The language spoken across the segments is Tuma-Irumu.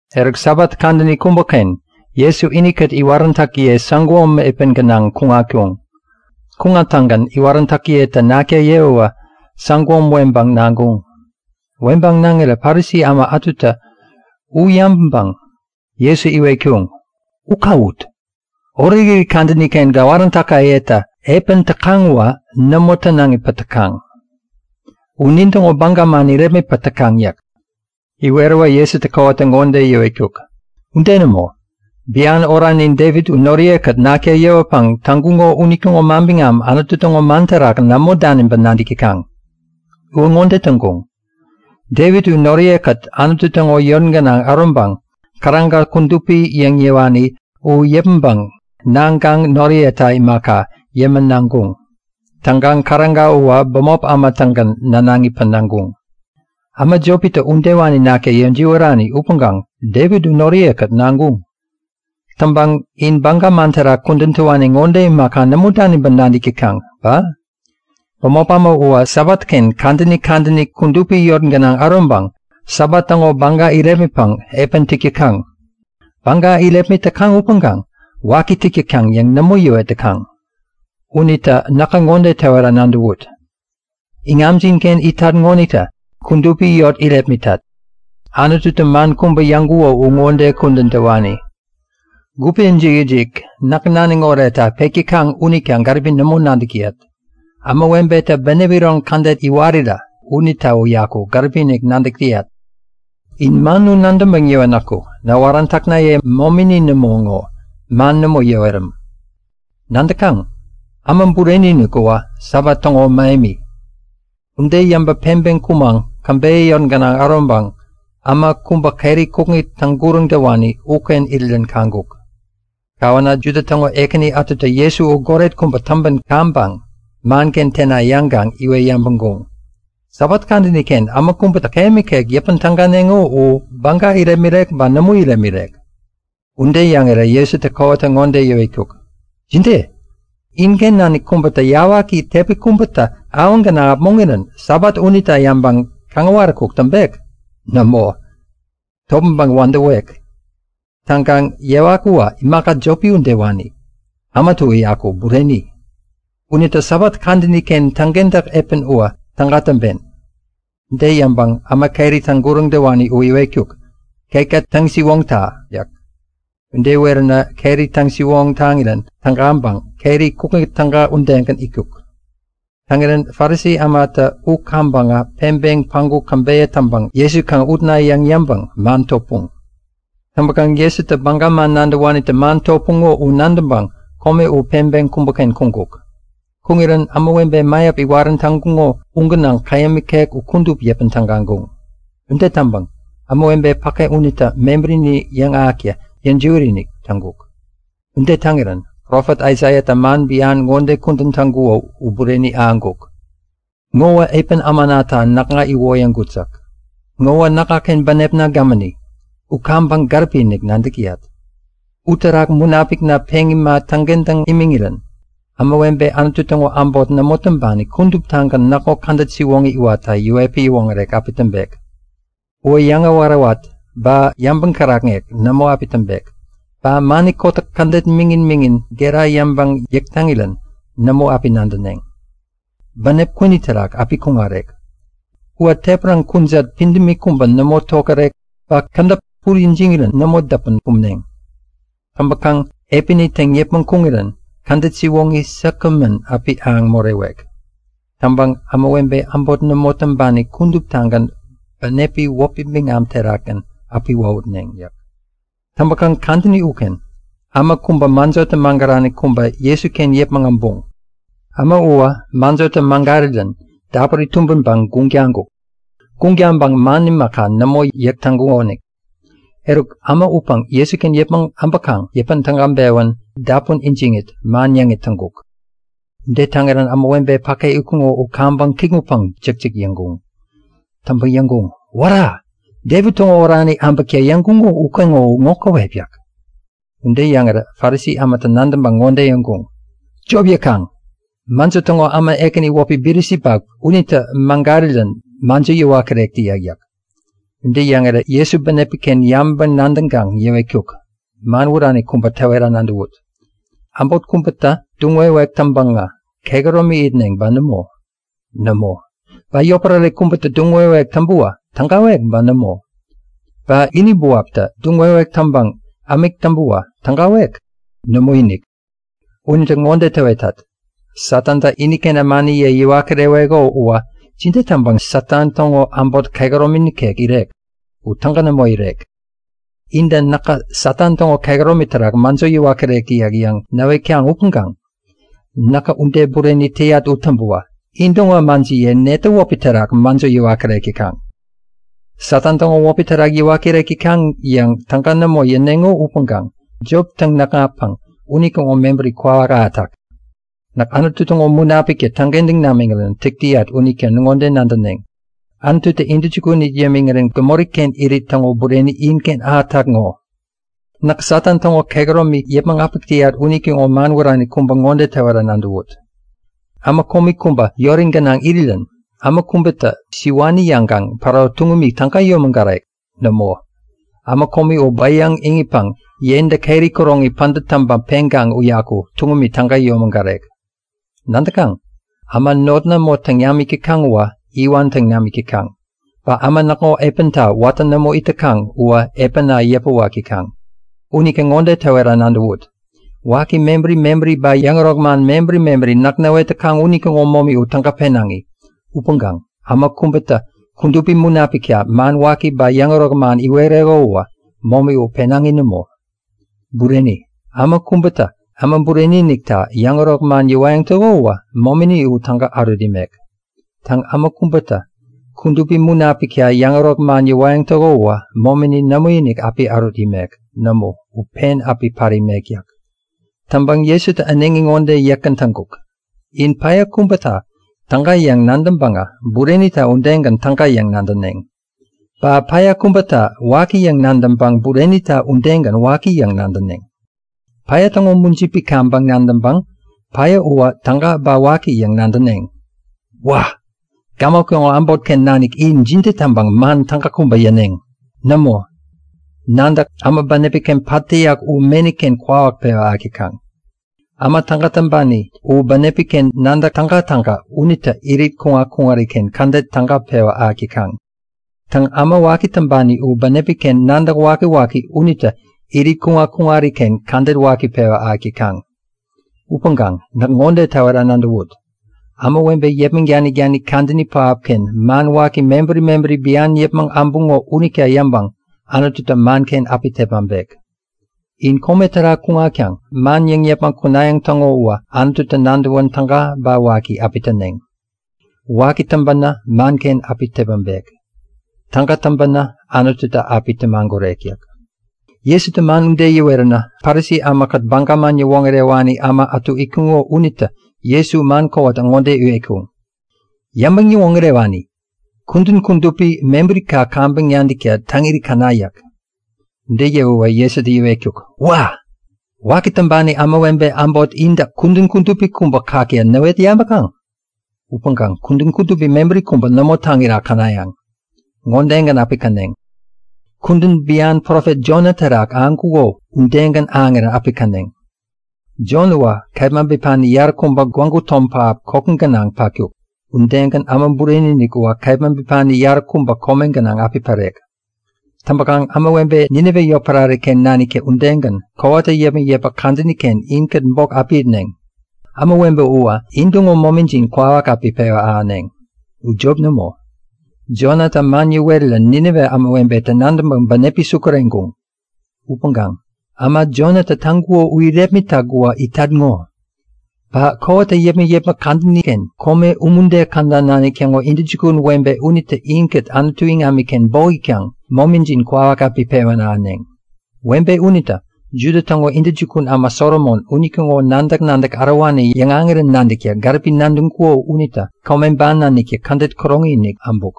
Eruk Sabat kadäni kubäken Jesu inikät iwaräntäkiye säguom epän gänaŋ kuŋatkuŋ. Kuŋattäŋgän iwaräntäkiyetä nakta yewäwä säguom weŋpäŋ naŋkuŋ. Weŋpäŋ naŋirä Parisi äma ätutä u yabäŋpäŋ Jesu iwetkuŋ; U kawut! Orekirit kadäni-ken gäwaräntäkayetä epän täkaŋ uwä nämo tänaŋipäŋ täkaŋ. U nintäŋo baga man irepmitpäŋ täkaŋ yäk. Iweräwä Jesutä kowata ŋode yäwetkuk; Ude nämo! Bian oranin Devit u noriye-kät nakta yewäpäŋ täŋkuŋo unitäŋo manbiŋam Anutu täŋo man terak nämo daniŋpäŋ nadäk täkaŋ? Uwä ŋode täŋkuŋ; Devit u noriye-kät Anutu täŋo yot gänaŋ äroŋpäŋ käräga kudupi yäŋ yäwani u yäpmäŋpäŋ naŋkaŋ noriyeta imaka, yämän naŋkuŋ. Täŋkaŋ käräga uwä bämop äma-tägän nänaŋipäŋ naŋkuŋ. Äma jopitä udewani nakta yäjiwärani upäŋkaŋ Devit u noriye-kät naŋkuŋ. Täŋpäŋ in Baga man terak kudän täwani ŋode imaka nämo daniŋpäŋ nadäk täkaŋ ba? Bämop äma uwä Sabatken kadäni kadäni kudupi yot gänaŋ äroŋpäŋ Sabat täŋo baga irepmitpäŋ epän täk täkaŋ. Baga irepmit täkaŋ upäŋkaŋ waki täk täkaŋ yäŋ nämo yäwet täkaŋ. Unita näkä ŋode täwera nadäwut; Iŋamjin-ken itat ŋonitä kudupi yot irepmitat. Anututä man kubä yäŋkuko uwä ŋode kudän täwani; Gupe ijik-ijik näk naniŋ oretta pek täkaŋ unita gäripi nämo nadäk täyat. Ämawebetä bänep iron kädet iwarirä unita uyaku gäripi-inik nadäk täyat. In man u nadäŋpäŋ yäwänäku näwaräntäknaye momini nämo ŋo man nämo yäweräm. Nadäkaŋ? Äma Bureni-inik uwä Sabat täŋo mähemi. Ude yäŋpäŋ peŋpeŋ kumaŋ käbeyä yot gänaŋ äroŋpäŋ äma kubä keri kukŋi täŋguräŋ täwani uken irirän kaŋkuk. Kawänä Juda täŋo ekäni ätutä Jesu u goret kubä täŋpän kaŋpäŋ manken tena yäŋkaŋ iwet yabäŋkuŋ; Sabat kadäni-ken äma kubätä käyäm ikek yäpän täganeŋo u baga irepmirek ba nämo irepmirek? Ude yäŋirä Jesutä kowata ŋode yäwetkuk; Jide? Inken nanik kubätä yawaki tepi kubätä awaŋ gänaŋ äpmoŋirän Sabat unita yäŋpäŋ kaŋäwaräkuk täŋpek? Nämo, topmäŋpäŋ wädäwek! Täŋkaŋ yawak uwä imaka jopi udewani. Äma uyaku bureni. Unita Sabat kadäni-ken täŋkentäk epän uwä täga täŋpen. Ude yäŋpäŋ äma keri täŋguräŋ täwani u iwetkuk; Ketka täŋ-siwoŋta! yäk. Ude iweränä keri täŋ-siwoŋ taŋirän tägaŋpäŋ keri kukŋi täga udegän itkuk. Täŋirän Parisi ämatä u kaŋpäŋä peŋpeŋ päŋku käbeyä täŋpäŋ Jesu kaŋ utna yäŋ yäŋpäŋ man topuŋ. Täŋpäkaŋ Jesu Baga man nadäwanitä man topuŋo u nadäŋpäŋ kome u peŋpeŋ kubäken kuŋkuk. Kuŋirän ämawebe mäyap iwarän täŋkuŋo u gänaŋ käyäm ikek u kudup yäpän tägaŋkuŋ. Ude täŋpäŋ ämawebe päke unitä mebärini yäŋahäkta yäjiwät-inik täŋkuk. Ude täŋirän Profet Aisaiatä man bian ŋode kudän täŋkuko u bureni ahäŋkuk; Ŋowä epän ämanata näkŋa iwoyäŋkut yäk. Ŋowä näkŋaken bänepna gämäni. U kaŋpäŋ gäripi nadäk täyat. Uterak Munapikna peŋ ima täŋkentäŋ imiŋirän ämawebe Anutu täŋo äbot nämo täŋpani kuduptagän näkŋo kädet siwoŋi iwatta yäwetpäŋ yäwoŋärek api täŋpek. Uwä yäŋawät-awät ba yabäŋ kärakŋek nämo api täŋpek. Ba mani kotäk kädet miŋin-miŋin gera yäŋpäŋ yäk täŋirän nämo api nadäneŋ. Bänep kwini terak api kuŋarek. Uwä tepäraŋ kujat pidämi kubä nämo tokärek ba kädäp täpuri ijiŋirän nämo däpän kumneŋ. Täŋpäkaŋ epäni täŋ yäpmäŋ kuŋirän kädet siwoŋi säkgämän api ahäŋ morewek. Täŋpäŋ ämawebe äbot nämo täŋpani kuduptagän bänepi wäpi biŋam terakgän api wohutneŋ yäk. Täŋpäkaŋ kadäni uken äma kubä mäjotä magärani kubä Jesuken yäpmäŋ äbuŋ. Äma uwä mäjotä magärirän dapuri tumbänpäŋ guŋ taŋkuk. Guŋ taŋpäŋ man imaka, nämo yäk täŋkukonik. Eruk äma upäŋ Jesuken yäpmäŋ äbäkaŋ yäpän tägaŋ-pewän dapun ijiŋit man yäŋit täŋkuk. Ude täŋirän ämawebe päke itkuŋo u kaŋpäŋ kikŋutpäŋ jäkjäk yäŋkuŋ. Täŋpäŋ yäŋkuŋ; Wära! Devit täŋo orani äbäkta yäŋkuŋo ukeŋo ŋo käwep yäk. Ude yäŋirä Parisi ämatä nadäŋpäŋ ŋode yäŋkuŋ; Jop yäkaŋ! Mäjo täŋo äma ekäni wäpi Bilisibap unitä magärirän mäjo yäwat kirek täyak! yäk. Ude yäŋirä Jesutä bänepi-ken yabäŋpäŋ-nadäŋkaŋ yäwetkuk; Man wärani kubä täwera nadäwut; Äbot kubätä duŋ-wewek täŋpäŋä kehäromi itneŋ ba nämo? Nämo! Ba yotpärare kubätä duŋ-wewek täŋpäwä tägawek ba nämo? Ba ini buaptä duŋ-wewek täŋpäŋ ämik täŋpäwä tägawek? Nämoinik! Unita ŋode täwetat; Satantä iniken ämaniye yäwat kireweko uwä jide täŋpäŋ Satan täŋo äbot kehäromi nikek irek? U täga nämo irek! Intä Näkä Satan täŋo kehäromi terak mäjo yäwat kirek täyat yäŋ näwetkaŋ upäŋkaŋ näkä ude bureni täyat u täŋpäwä intäŋo ämajiyetä netä wäpi terak mäjo yäwat kirek täkaŋ? Satan täŋo wäpi terak yäwat kirek täkaŋ yäŋ täga nämo yäneŋo unita jop täŋ-näkŋatkaŋ unitäŋo mebäri kwawak ahätak! Näk Anutu täŋo Munapiktä täŋkentäŋ namiŋirän täk täyat unita ŋode nadäneŋ; Anututä intäjukun it yämiŋirän gämoriken irit täŋo bureni inken ahätak ŋo. Näk Satan täŋo kehäromi yäpmäŋ äpäk täyat unitäŋo man wärani kubä ŋode täwera nadäwut; Äma komi kubä yori gänaŋ irirän äma kubätä siwani yäŋkaŋ päro tuŋumi täga yomägarek? Nämo! Äma komi u bäyaŋ iŋitpäŋ yentä keri kuroŋi pädät täŋpäŋ peŋkaŋ uyaku tuŋumi täga yomägarek. Nadäkaŋ? Äma not nämo täŋ namik täkaŋ uwä iwan täŋ namik täkaŋ. Ba äma näkŋo epänta watä nämo it täkaŋ uwä epäna yäpäwak täkaŋ. Unita ŋode täwera nadäwut; Waki mebäri mebäri ba yäŋärok man mebäri mebäri näk näwet täkaŋ unitäŋo momi u täga penaŋi. Upäŋkaŋ äma kubätä Kudupi Munapikta man waki ba yäŋärok man iwereko uwä momi u penaŋi nämo. Bureni, äma kubätä Äma Bureni-inikta yäŋärok man yäwayäŋ täko uwä momini u täga ärut imek. Täŋ, äma kubätä Kudupi Munapikta yäŋärok man yäwayäŋ täko uwä momini nämoinik api ärut imek. Nämo, u pen api pat imek yäk. Täŋpäŋ Jesutä äneŋi ŋode yäkgän täŋkuk; In päya kubäta täga yäŋ nadäŋpäŋä burenita udegän täga yäŋ nadäneŋ. Ba päya kubäta waki yäŋ nadäŋpäŋ burenita udegän waki yäŋ nadäneŋ. Päya täŋo mujipi kaŋpäŋ nadäŋpäŋ päya uwä täga ba waki yäŋ nadäneŋ. Wa! Gämok täŋo äbotken nanik in jide täŋpäŋ man täga kubä yäneŋ? Nämo, nadäk, äma bänepi-ken pat täyak u meni-ken kwawak pewä ahäk täkaŋ. Äma täga täŋpani u bänepi-ken nadäk tägatäga unitä irit kuŋat-kuŋariken kädet täga pewä ahäk täkaŋ. Täŋ, äma waki täŋpani u bänepi-ken nadäk wakiwaki unitä irit kuŋat-kuŋariken kädet waki pewä ahäk täkaŋ. Upäŋkaŋ näk ŋode täwera nadäwut; Ämawebe yäpmäŋ danik-danik kadäni pähapken man waki mebäri mebäri bian yäŋ yäpmäŋ äbuŋo unita yäŋpäŋ Anututä manken api tepmaŋpek. In kome terak kuŋatkaŋ man yäŋ yäpmäŋ kunayäŋ täŋo uwä Anututä nadäwän täga ba waki api täneŋ. Waki täŋpänä manken api tepmaŋpek. Täga täŋpänä Anututä api tämagurek yäk. Jesutä man ude yäweränä Parisi ämakät Baga man yäwoŋärewani äma ätu itkuŋo unitä Jesu man kowata ŋode iwetkuŋ; Yäŋpäŋ-yäwoŋärewani! Kudän kudupi kubä mebärika kaŋpäŋ nadäkta täŋiri käna! yäk. Ude yäwäwä Jesutä yäwetkuk; Wa! Waki täŋpani ämawebe äbot intä kudän kudupi kubä kakta näwet yabäkaŋ? Upäŋkaŋ kudän kudupi mebäri kubä nämo täŋira känayäŋ! Ŋodegän api käneŋ; Kudän bian profet Jona terak ahäŋkuko udegän ahäŋirän api käneŋ. Jona uwä kepma bipani yaräkubä gwägu tom pähap koki gänaŋ patkuk. Udegän Äma Bureni-inik uwä kepma bipani yaräkubä kome gänaŋ api pärek. Täŋpäkaŋ ämawebe Ninive yotpärare-ken naniktä udegän, kowata yäpmäk-yäpmäk kadäni-ken inkät bok api itneŋ. Ämawebe uwä intäŋo momijin kwawak api pewä ahäneŋ. U jop nämo, Jonatä man yäwerän Ninive ämawebetä nadäŋpäŋ bänepi sukureŋkuŋ. Upäŋkaŋ äma Jonatä täŋkuko u irepmitak uwä itat ŋo! Ba kowata yäpmäk-yäpmäk kadäni-ken kome umude käda nanik täŋo intäjukun webe unitä inkät Anutu iŋamiken bok itkaŋ momijin kwawak api pewän ahäneŋ. Webe unitä Juda täŋo intäjukun äma Solomon unitäŋo nadäk-nadäk ärowani yäŋahäŋirän nadäkta gäripi nadäŋkuko unita kome ban naniktä kädet käroŋi-inik äbuk.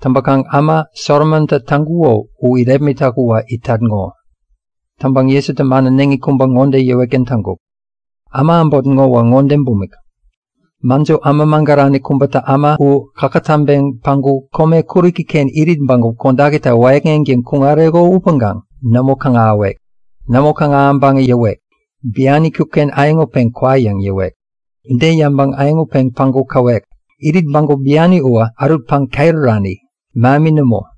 Täŋpäkaŋ äma Solomontä täŋkuko u irepmitak uwä itat ŋo! Täŋpäŋ Jesutä man äneŋi kubä ŋode yäwetgän täŋkuk; Äma äbot ŋowä ŋode bumik. Mäjo äma magärani kubätä äma u kakätäŋpeŋ päŋku kome kuräki-ken irit bägup kodakita wäyäkŋeŋtäŋ kuŋareko upäŋkaŋ nämo kaŋ-ahäwek. Nämo kaŋ-ahäŋpäŋä yäwek; Bian itkut-ken äyäŋutpeŋ kwa yäŋ yäwek. Ude yäŋpäŋ äyäŋutpeŋ päŋku käwek; Irit bägup biani uwä ärutpäŋ ket urani, mähemi nämo.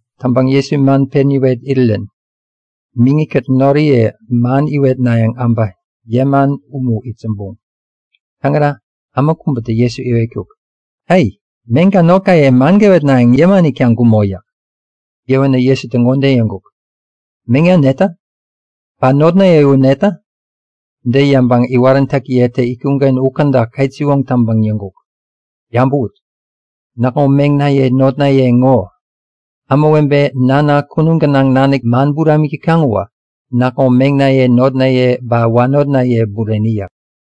Täŋpäŋ Jesu man pen yäwet irirän miŋi-kät noriye man iwetnayäŋ äbä yäman umu itsämbuŋ. Täŋirä äma kubätä Jesu iwetkuk; Ai! Meŋka notkaye man gäwetnayäŋ yäman itkaŋ gumo yäk. Yäwänä Jesutä ŋode yäŋkuk; Meŋna netä? Ba notnaye u netä? Ude yäŋpäŋ iwaräntäkiyetä itkuŋ-ken u käda ketsiwoŋ taŋpäŋ yäŋkuk; Yabäwut! Näkŋo meŋnaye notnaye ŋo! Ämawebe Nana kunum gänaŋ nanik täŋo man buramik täkaŋ uwä näkŋo meŋnaye notnaye ba wanotnaye bureni yäk.